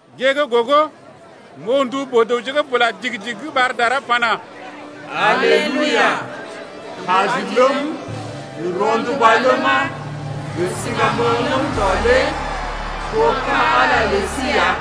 Gée gə́ gogo m’oo ndu boo-dəwje gə́ bula digi-digi gə́ ɓar dara pana: Aleluia! Kaji, ləm gə rɔnduba ləma, gə siŋgamoŋ ləm tɔ lé to ka̰ Ala lə sí ya,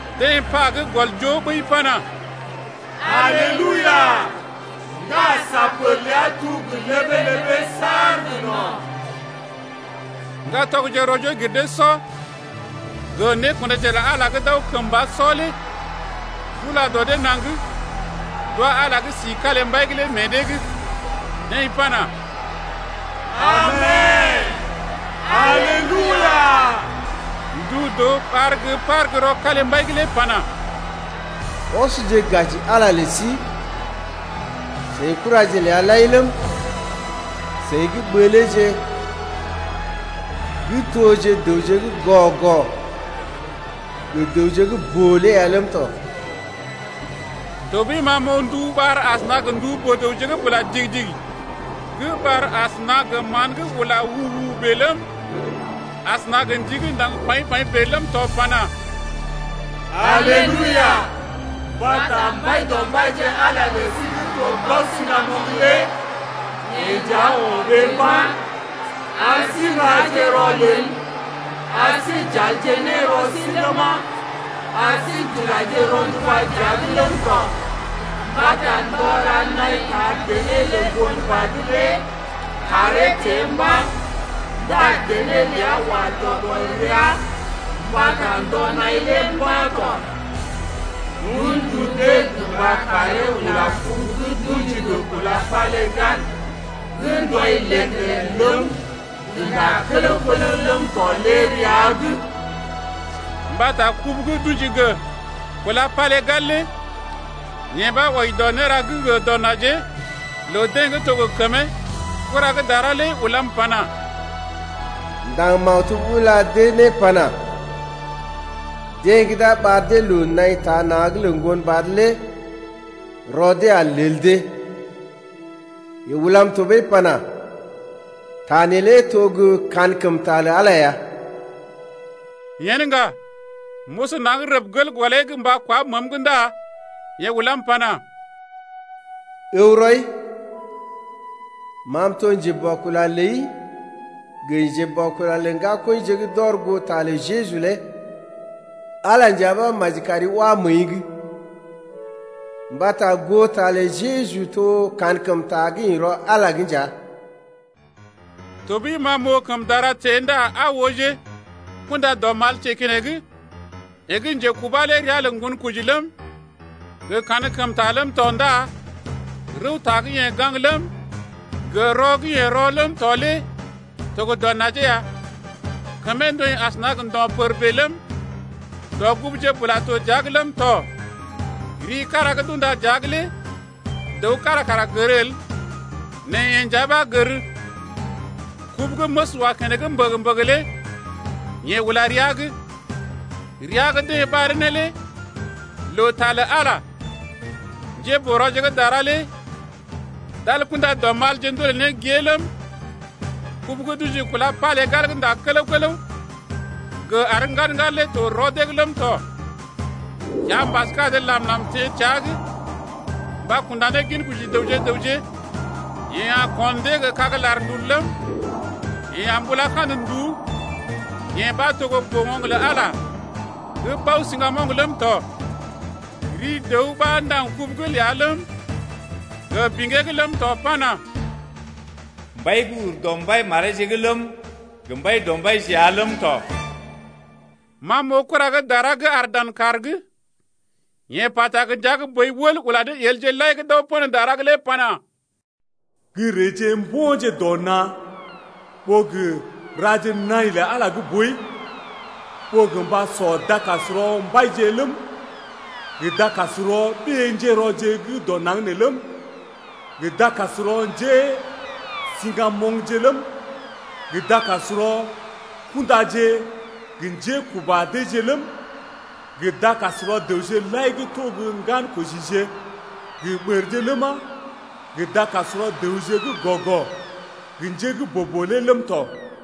Deḛ pa gə́ gɔl joo ɓəi pana: Aleluia! Ndá sa pər ləa tuu gə ləbee-ləbee saar gə no̰. Ŋgatɔgje rɔ-joo-gir-dee-sɔ gə nékundaje lə Ala gə́ d’aw kəmba sɔ lé d’ula dɔ dee naŋg d’wa Ala gə́ si kalimbai’g lé meḛ dee’g, deḛ pana: Amen! Aleluia! Ndu dəw ɓar gə́ par gə́ rɔ kalimbai’g lé pana: Ɔsje gaji Ala lə sí, seḭ kuraje ləa lai ləm, seḭ gə́ ɓəleeje gə́ toje dəwje gə́ gɔ-gɔ gə dəwje gə́ boo lé ya ləm tɔ. Tɔɓəi ma m’oo ndu ɓar asəna gə ndu boo-dəwje gə́ bula digi-digi gə́ ɓar asəna gə mán gə́ ula u-u-u bèe ləm, asəna gə ndi gə́ ndaŋg paḭ-paḭ bèe ləm tɔ pana: Aleluia! Mbata Mbaidɔmbaije Ala lə sí gə́ to Bao-siŋgamoŋ lé yeḛ nja o̰ ɓee mba̰. Ar sí n’raje rɔlel, ar sí j’alje ne rɔ sí ləma, ar sí j’ulaje rɔnduba dəa’g ləm tɔ, mbata ndɔ ra naḭ taa dené lə Ŋgonbad lé kàree teḛ mba̰ ndá dené ləa wa dɔ gɔl rəa mbata ndɔ-naḭ lé mba̰ tɔ. D’un ndu dee gə mba karee ula kubu gə́ d’ṵji gə kúla palégal gə́ ndɔḭ ləd-ləd ləm, gə́ ndá kələw-kələw ləm tɔ lé rəa’g. Mbata kubu gə́ d’ṵji gə kúla palégal lé yee ɓa wɔji dɔ néra gə́ gə dɔ najee lə dee gə́ to gə kəmee. Kura gə́ dara lé ulam pana: Ndaŋ maktub ula dee ne pana: Deḛ gə́ d’a ɓar dee loo naḭ taa na̰’g lə Ŋgonbad lé rɔ dee a lel dee. Yeḛ ulam tɔɓəi pana: Ta neelé to gə́ kankəmta lə Ala ya. Yen ŋga, m’oso naŋg rəb gel gɔlee’g mba kwá məəm’g ndá yeḛ ulam pana: Ǝw rɔi! Ma m’to njeboakula ləi gə njeboakula lə ŋgakɔḭje gə́ d’ɔr goo ta lə Jeju lé. Ala nja ɓa maji kari wá məəi’g. Mbata goo ta lə Jeju to kankəmta gə́ ḭ rɔ Ala’g nja. Tɔɓəi ma m’oo kəm dara teḛ ndá aa ooje, kunda-dɔmal teḛ keneŋ. Yeḛ gə́ njekubá lé ria lə Ŋgonkoji ləm, gə Kankəmta ləm tɔ ndá rəwta gə́ yeḛ gaŋg ləm, gə rɔ gə́ yeḛ rɔ ləm tɔ lé to gə dɔ najee ya. Kəmee ndɔḭ asəna gə ndo̰ pər bèe ləm, dɔguguje bula to dəa’g ləm tɔ. Ri kára gə́ d’unda dəa’g lé dəw kára kara gər el, nɛ yeḛ nja ɓa gər. Kubu gə́ məs wa keneŋ mbəgə-mbəgə lé yeḛ ula rəa’g. Ria gə́ deḛ ɓaree ne lé lə Ta lə Ala. Njéboo-rɔje gə́ dara lé d’al kunda-ndulije ndolè ne gée ləm, kubu gə́ d’ṵji gə kúla palégal gə́ ndá kələw-kələw gə àr ŋgad-ŋgad lé to rɔ dee’g ləm tɔ. Kiambas gə́ adə làm-làm teḛ təa’g mba kunda ne ginkoji dəwje gə raŋg. Yeḛ a ko̰ dee gə kag-larndul ləm, yeḛ a mbula kandə nduú, yee ɓa to gə́ boo-oŋg lə Ala gə́ Bao-siŋgamoŋ ləm tɔ. Ri dəw ɓa ndaŋg kubu’g ləa ləm, gə biŋgee’g ləm tɔ pana: Mbai gə́ ur dɔ mbai mareeje’g ləm, gə Mbaidɔmbaije ya ləm tɔ. Ma m’oo kura gə́ dara gə́ aar dan kàr’g. Yeḛ pata gə ndia gə́ boi wəl ula ne yelje lai gə́ d’aw pə̰ dara’g lé pana: Gə́ reeje mbo̰je dɔ na̰ ɓó gə raje naḭ lə Ala gə́ boi 8ɓó gə mba sɔ dakasrɔ mbaije ləm, gə dakasrɔ ɓé-njérɔje gə́ dɔ naŋg nee ləm, gə dakasrɔ njésiŋgamoŋje ləm, gə dakasrɔ kundaje gə njékuba deeje ləm, gə dakasrɔ dəwje lai gə́ to gə ŋgankojije gə ɓərje ləma, gə dakasrɔ dəwje gə́ gɔ-gɔ gə njé gə́ boo-boo lé ləm tɔ.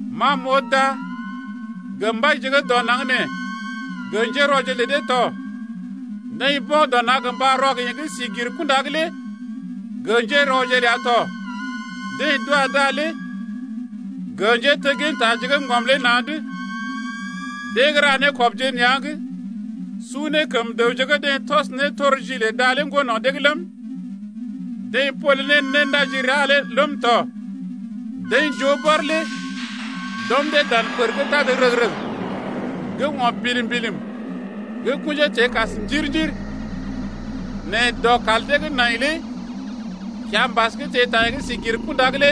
Ma m’oo da gə mbaije gə́ dɔ naŋg nee gə njérɔje lə dee tɔ. Deḛ mbo̰ dɔ na̰ gə mba rɔ gə yeḛ gə́ si gir kunda’g lé gə njérɔje ləa tɔ. Deḛ d’wa da lé gə njéteggintaje gə́ ŋgɔm lé na̰’d, deḛ gə́ ra nékɔbje nea̰’g su ne kəm dəwje gə́ deḛ tɔs nétorji lə da lé ŋgo no̰ dee’g ləm, deḛ pole ne néndajirea lé ləm tɔ. Deḛ joo bɔr lé d’ɔm dee dan pər gə́ tad rəg-rəg gə́ o̰ bilim-bilim gə́ kṵjee teḛ kas njir-njir. Nɛ dɔkal deḛ gə́ nai lé kiambas gə́ teḛ ta yeḛ gə́ sí gir kunda lé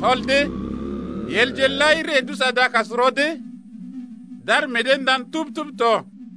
tɔl dee. Yelje lai ree d’usɔ dakasrɔ dee d’ar meḛ dee ndan tub-tub tɔ.